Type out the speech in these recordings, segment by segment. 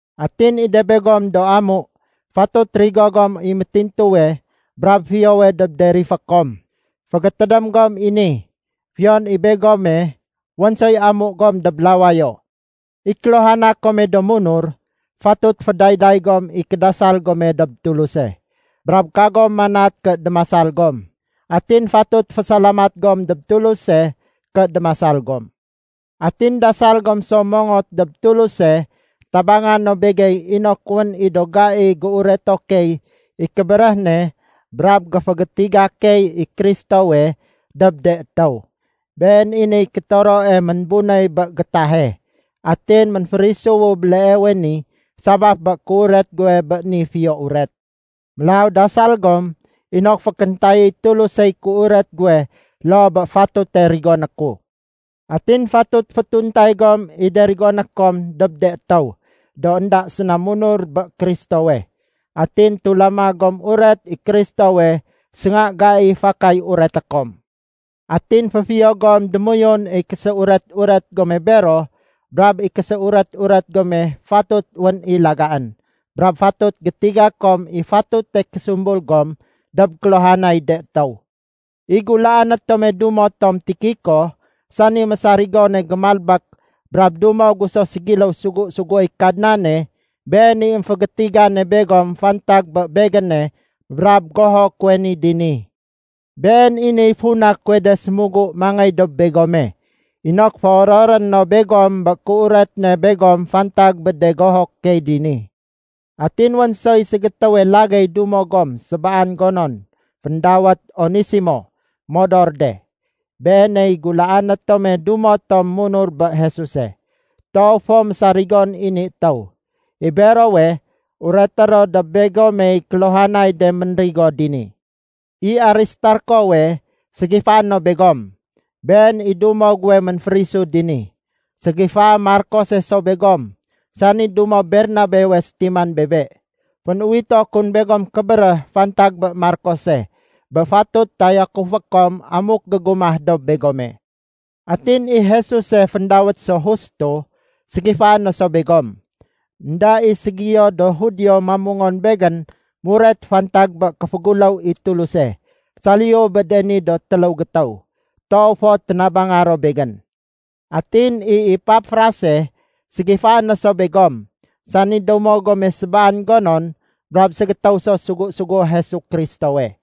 Atin i de begom do amu, fatut rigo gom i métintuwe brab fiyowe dob de rifé kom. Fégétédém gom i ni, fiyon i begome, wén soy Amu gom dob lawayo. I kéluhana kome do munur, fatut fédayday gom i kédasal gome dob Tuluse. Brab kagom manat ké démasal gom. Atin fatut fésalamat gom dob Tuluse ké démasal gom. Atin dasal gom so mongot dob Tuluse tabanga no begey inok wén i do gai géureto key i kébéréh ne brab géfégétiga key i Kristowe dob de étéw. Been i niy kétoroe ménbunéy bé gétahe. Atin ménférisuwu béleewe ni sabaf bé kéuret guwe bé ni Fiyo Uret. Mélaw dasal gom inok fékéntayéy Tulusey kéuret guwe loo bé fatute rigoné ku. Atin fatut fétuntay gom i de rigoné kom dob de étéw do énda séna munur bé Kristowe, atin tulama gom uret i Kristowe sénga gai fakay ureté kom. Atin féfiyo gom démoyun i késéuret-uret gome bero brab i késéuret-uret gome fatut wén i lagaén. Brab fatut gétiga kom i fatute késumbul gom dob kéluhanay de étéw. I gulaané tome dumo tom Tikiko, sani mésarigone gémalbék brab dumo gu so ségiléw sugu-suguéy Kadnane, been i émfégétigane begom fantag bé begéne brab goho kuwe ni dini. Been i niy funa kuwe de sémugu mangéy dob begome, inok féororé no begom bé kéuret ne begom fantag bé de goho key dini. Atin wén soy ségétéwe lagéy dumo gom sébaan gonon féndawét Onesimo modor de. Beeney gulaané tome dumo tom munur bé Jesuse. Toow fo mésarigon i ni étéw. I berowe, ureté ro dob begomey kéluhanay de ménrigo dini. I Aristarkowe, ségifaé no begom. Been i dumo guwe ménférisu dini. Ségifaé Markose so begom, sani dumo Bernabewe sétiman bebe. Fén-uwito kun begom kébéréh fantag bé Markose, bé fatut tayakufé kom amuk gégumah dob begome. Atin i Jesuse (féndawét so Justo) ségifaé no so begom. Enda i ségiyo do Judio mamungon begén muret fantag bé kéféguléw i Tuluse, saliyu bé de ni do téléw gétéw. Toow fo ténabanga ro begén. Atin i Epafrase, ségifaé no so begom, sani dumo gome sébaan gonon brab ségétéw so sugu-sugué Jesu Kristowe.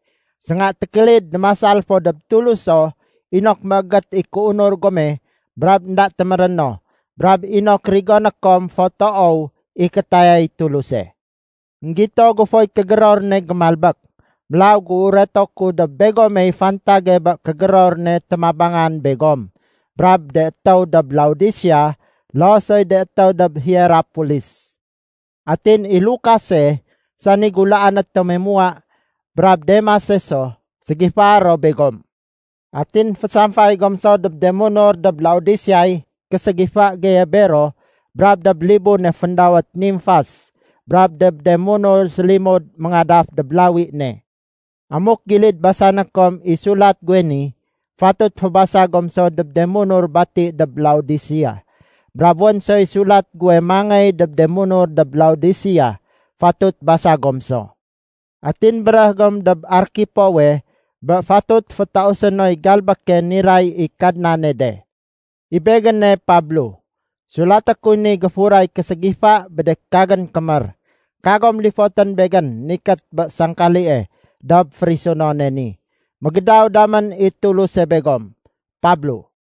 Sénga tékélid démasal fo dob Tuluso inok méégét i kéunur gome brab énda téméréno, brab inok rigoné kom fo toow i kétayay Tuluse. Enggito gu foy kégéror ne gémalbék, mélaw géureto ku dob begomey fantage bé kégéror ne témabangan begom brab de étéw dob Laodisea loo soy de étéw dob Hierapolis. Atin i Lukase, sani gulaané tome muwa brab Demase so, ségifae ro begom. Atin fésamfay gom so dob de munur dob Laodiseay késégifa geye bero brab dob libune féndawét Nimfas brab dob de munur sélimud méngadaf dob lawi ne. Amuk gilid basané kom i sulat guwe ni, fatut fébasa gom so dob de munur bati dob Laodisea. Brab wén soy sulat guwe mangéy dob de munur dob Laodisea, fatut basa gom so. Atin béréh gom dob Arkipowe bé fatut fétausé noy galbéke niray i Kadnane de. I begéne Pablo, sulaté kuy ni géfuray késégifa bé de kagén kémér. Kagom lifotén begén nikét bé sangkalie dob férisunone ni. Mégédaw damén i Tuluse begom. Pablo